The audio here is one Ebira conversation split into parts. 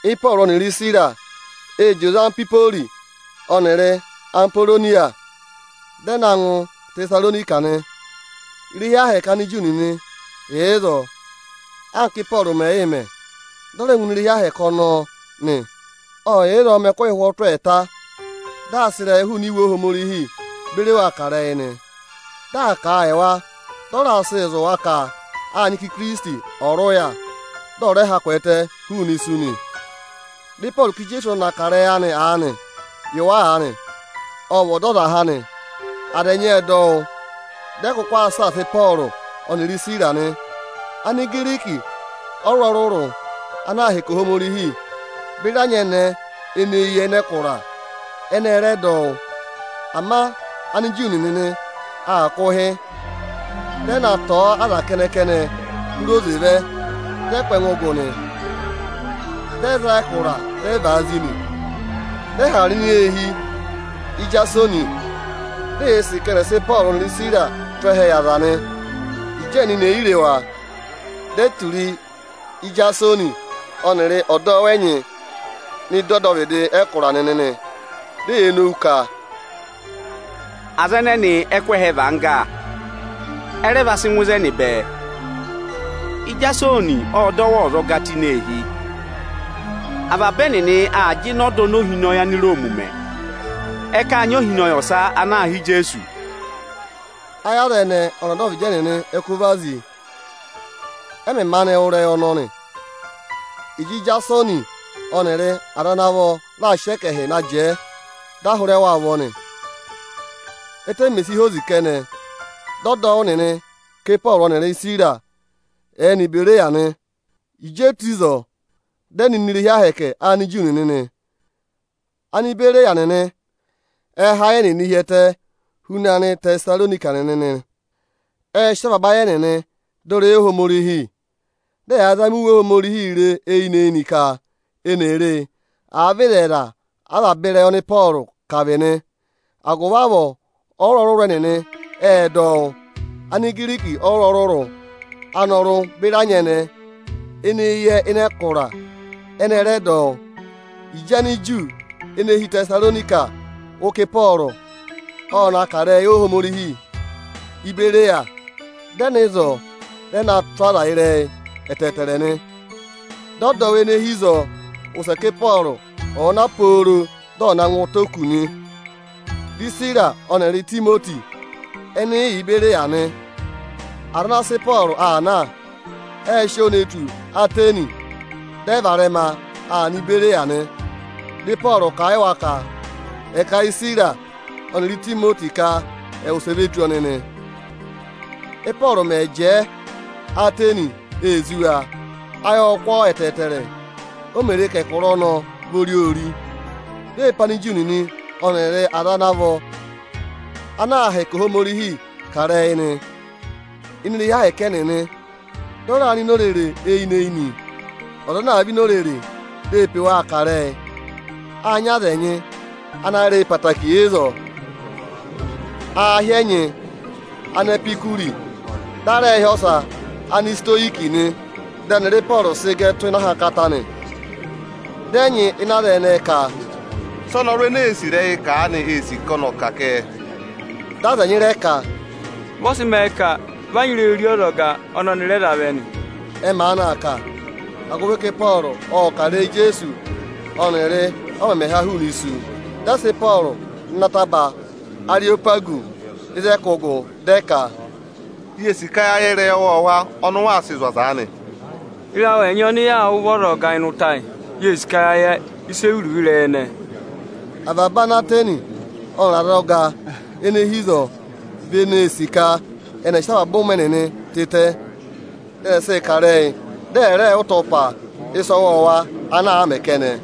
Ịpọọrụ ọnịrị Isira ệ zị oze Anhwipori ọnịrị Aporoniya, dị ẹ na ngụ Ịtẹsaronika nị. Irehi ahẹkẹ Aniju nịnị yà ịzọọ. Anka Ị́pọọrụ mẹ̀ yị mẹ, dị ọ rẹ ngụ ini irehi Ohomorihi ọnọọ nị. Ộ yà ịzọọ mẹ ẹkụhị ụhwọtụ ẹẹta, dị aa sị ịrẹyịị hụụnị Iwe Ohomorihi beri wa kà ịrẹyị nị. Dị aa kà a yị wa, dị ọ raa sịị zụ̀ wa ka â nyị ka Ikirisiti ọ̀ rị ụya, dị ọ̀ rẹ ha kwẹẹtẹ hụụnị isu nị. Dị Ịpọọrụ ka Ijeesu ọnị ọnị aa kà ịrẹyị anịị yị wa aanị, ọ vị Ọdọzaha nị. Aza ẹnyị ệ dọ wụ́, dị ẹ kụkụ aa saasa Ịpọọrụ ọnịrị Isira nị. Anigiriki ọrụrụ-ọrụrụ ana aa hẹkẹ Ohomorihi beri anyẹnẹẹ ene eyi yẹ ịnị ẹkụra, ẹnị ẹ rẹ dọ wụ́. Ama Aniju nịnị aa kụ̀ ụhị. Dị ẹ na tọ̀ọ́ aza kẹnẹ-kẹnẹ hụrẹ oze vẹ, dị ẹ kụ́ ẹngụ gụ nị. Dị ẹ za ẹkụra, dị ẹ vàa zí nị. Dị ẹ hara nọ ini eehi Ijasoni, di eyee sì ka ẹnị ẹ̀ sị Ịpọọrụ ọnịrị Isira tụ́ ẹhẹ yị aza nị. Ịjị ẹnịnị è yi re wa, di e tura Ijasoni ọnịrị ọdọwụ ẹnyị nọ ịdị ọdọvịdị ẹkụra nịnị nị. Di eyee nowu ka, “Aza ẹnẹnị ẹ kụ́ ẹhẹ và angga, ẹ rẹ va sị ngụ ịzẹnị bẹẹ. Ijasoni ộ dọ wa ọzọga tụ́ ini eehi. Avaba ẹnịnị aa jịnẹ ọda oni ohinọyị Aniroomi mẹ. Ẹ ka â nyị ohinọyị ọsa ana aā hị́ Ijeesu.” Ayị aza ẹnẹẹ ọnịrị ọdọvịdị ẹnịnị ẹ kụ́ vazi, ẹ mẹ̀ maanị wụ́ ịrẹyị ọnọnị. Ịjị Ijasoni ọnịrị aza ana vọ raà sị ẹkẹhị na jẹẹ, dị a hụrẹ wa ụvọ nị. Ẹ́tẹ mè si hozi kẹnẹ, dị ọdọwụ nịnị ka Ịpọọrụ ọnịrị Isira ẹ̀ẹ nọ Ibereya nị. Ịjị e tù ịzọọ, dị ẹ nọ ini irehi Ohomorihi Aniju nịnị nị. Anibereya nịnị ẹ dọ ịrẹyị Ohomorihi tụ́ ịnị ayị huna Anịtẹsaronika nịnị nị. Ệ sị avaba ayị ẹnịnị dọ ịrẹyị Ohomorihi. Dị ẹyaa zama Iwe Ohomorihi re eyinị-eyinị ka eni è re e, àa vị ịzẹyịza avaba ịrẹyị ọnị Ịpọọrụ kà vị nị. Agụvị avọọ ọrụrụ-ọrụrụ ẹnịnị ệ dọ wụ́. Anigiriki ọrụrụ-ọrụrụ anọrụ beri anyẹnẹẹ ene eyi yẹ ịnị ẹkụra, ẹnị ẹ rẹ dọ wụ́. Ịjị Aniju ene hi Ịtẹsaronika wụ́ ka Ịpọọrụ ọ na kà ịrẹyị Ohomorihi Íbereya, dị ẹ nọ ịzọọ, dị ẹ na tụ́ aza ịrẹyị ẹtẹẹtẹrẹ nị. Dị ọdọwụ ene hi ịzọọ wụsẹ ka Ịpọọrụ ọ̀ọ na huuu dị ọ̀ na ngụ ụtọ oku nị. Di Isira ọnịrị Itimoti ẹnị yị yà Ibereya nị. Aza ana sị Ịpọọrụ aa na, ệ sị ọọ ne tù Atẹnị. Dị ẹ varẹma aa nọ Ibereya nị. Dị Ịpọọrụ kà a yị wa ka ẹ̀ kà a yị Isira ọnịrị Itimoti ka ẹ̀ wụsẹ ve tù ọnị nị. Ị́pọọrụ mẹ̀ jẹẹ Atẹnị, ee zí wa, ayị ộ kụ́ ọọ ẹtẹẹtẹrẹ, o mè re ka ẹkụra ọnọọ vị ori-ori. Di ee pe Aniju nịnị ọnịrị aza ana vọ ana aa hẹkẹ Ohomorihi kà ịrẹyị ini irehi Ohomorihi ẹnịnị. Dị ọ raa nọ ini orere eyinị-eyinị, ọza ana àa vẹ ini orere, di ee pe waa kà ịrẹyị. Â nyị aza ẹnyị ana yẹ ịrẹyị ẹtẹẹtẹrẹ ịzọọ. Aā hị́ ẹnyị “Anepikuri”, dị a rẹẹ̄ hị́ ọsa “Anisitoyiki” nị. Dị ẹnịrị Ịpọọrụ sị gẹ tụ́ ịnị ahankata nị, ẹnyị ịnị aza ẹnẹẹ ka, “Sị ọnọrụ ene ee sì ịrẹyịị kà aanị ee sì ka ọnị ọ̀ ka kẹ?” Dị aza ẹnyị rẹ ka, “Vị ọ sị mẹẹ ka vị a nyị ịrẹyị ori ọzọga ọnị ọnị rẹ za vẹ nị.” Ẹ maanị aa kà, agụvị ka Ịpọọrụ ộ kà ịrẹyị Ijeesu ọnịrị ọ mẹmẹ ha hụụnị isu. Dị ẹ sị Ịpọọrụ nọ ịnị ataba Ariyopagusi ịzị ẹ kụ́ gụ, dị ẹ ka, “Yee sì ka ya yẹ ịrẹyị ọwọọwa ọnị ụ waa sịị zụ̀ aza aanị. Ịrẹyị awụ ẹnyị ọnị yaa wụ́ vị ọzọga ịnị ụtọ ayị. Yee sì ka ya yẹ ịsị ẹ vị iruvo ịrẹyị ẹnẹẹ.” Avaba Anatẹnị ọnịrị azọga ene hi ịzọọ vị eneē sì ka ẹnị ẹ̀ sị avaba ụmẹ ẹnịnị tịtẹ, dị ẹnị ẹ̀ sịị kà ịrẹyị, dị ẹ̀ rẹẹ̄ wụ́ ịtọpa ịsa ọwọọwa ana àa mẹ kẹnẹ.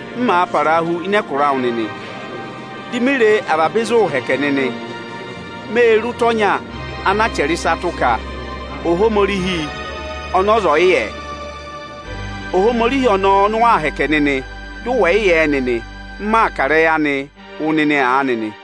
M màa parahu ịnị ẹkụra awụ nịnị, di mi re avaba ịzị ụụ̄ mẹ hẹkẹ nịnị; mê re ụta ọnya anaa chẹrẹ ịsa tụ́ ka: ‘Ohomorihi ọnị ọza ẹ̀ yị yẹ.’ Ohomorihi ọnọọ ọnị ụ waa hẹkẹ nịnị, dị ụ wẹ̀ yị yẹ ẹ nịnị, m maa kà ịrẹyị anịị wụ nịnị aanị nị.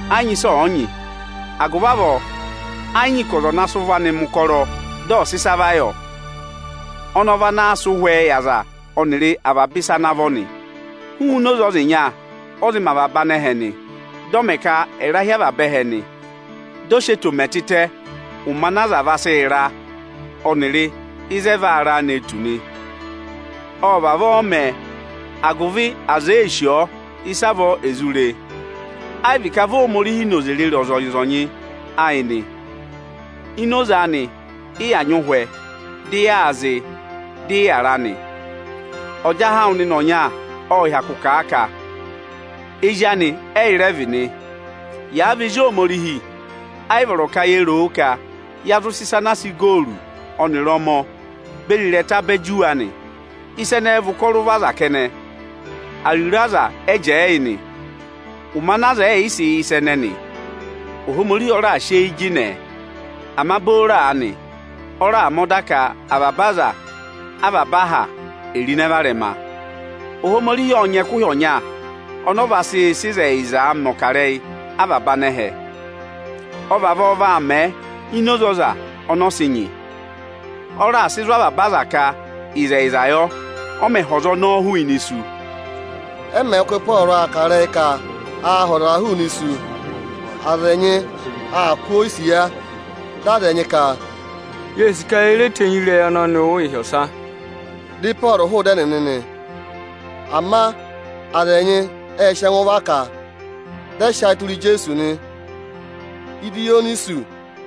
Ẹ yị nyị ịsị ọ̀ yị nyị, agụvị avọọ ẹ yị nyị ka ọza ọ̀ na sị ụvọ anị mẹ̀ ụkọrọ dị ọ̀ sị ịsa va yọ. Ọnị ọ vanaā sị ụhwẹẹ yị aza ọnịrị avaba ịsa ana vọ nị. Hụụnị oze ọza ịnya ọ zị mẹ avaba anẹhẹ nị, dị ọ mẹ ka ẹ̀ ra hi avaba ẹhẹ nị. Dị ọ sị eto mẹ tịtẹ ụmẹ ana aza vaa sị ra, ọnịrị ịzị ẹ vaa ra nee tù nị. Ọ vavọọ mẹ, agụvị aza èe sì ọọ, ịsavọọ è zụ re e. Ẹ yị vị ka vị Ohomorihi noze rịrị ọzịnya-ọzịnya ayị nị. Ini oze anị, ị yà nyị ụhwẹ, dị yaa zịị, dị ị yàra nị. Ọjahẹ awụ nịnị ọnya ộ hyakụ kà a ka: ‘Ezi anị ẹ́yị rẹ vị nị.’ Yàa vị ezi Ohomorihi, ẹ yị vọrọ ka ye ro o ka ya zụ sị ịsa anaa sị igooru ọnịrị ọmọ beri ịrẹta bẹ juwe anị. Ịsa ẹnẹẹ vị ụkọrọ ụvọ aza kẹnẹ; ariro aza ẹ jẹẹ yị nị. Ụmẹ ana aza ẹ̀ yị sị yẹ ịsa ẹnẹnị, Ohomorihi ọ raà sị eyi jịnẹ ẹ. Ama booro aanị, ọ raà mẹ ọda ka avaba aza avaba aha è ro ịnẹ varẹma. Ohomorihi ộ nyị ẹkụhị ọnya ọnọọ vaa sị sị ịzẹyịzaa mẹ̀ ọkarẹyị avaba anẹhẹ. Ọ vavọọ vaa mẹ ini oze ọza ọnị ọ sị nyị. Ọ raà sị zụ̀ avaba aza ka ịzẹyịza yọ, ọ mẹ̀ ha ọza ọnọọ hụụnị isu.” Ẹ mẹ̀ wụ́ ka Ịpọọrụ ộ kà ịrẹyị ka aa ha ọzaa hụụnị isu, aza ẹnyị aa kụ́ ọọ isiya. Dị aza ẹnyị ka, “Yee sì ka ye re tenyi ịrẹyị ọnọọ wụ́ ịhị ọsa.” Dị Ịpọọrụ hụụ ịdị ẹnịnị nị. Ama aza ẹnyị ệ sị ẹngụ vaka a, dị ẹ sị ayị tụra Ijeesu nị. Idiyonisu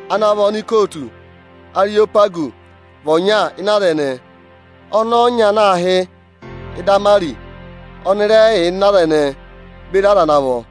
ana vị anikootu Ariyopagusi vị ọnya ịnị aza ẹnẹẹ. Ọnẹẹ ọnya ana aā hị́ Idamarisi ọnị rẹ yà ịnị aza ẹnẹẹ, beri aza ana vọ.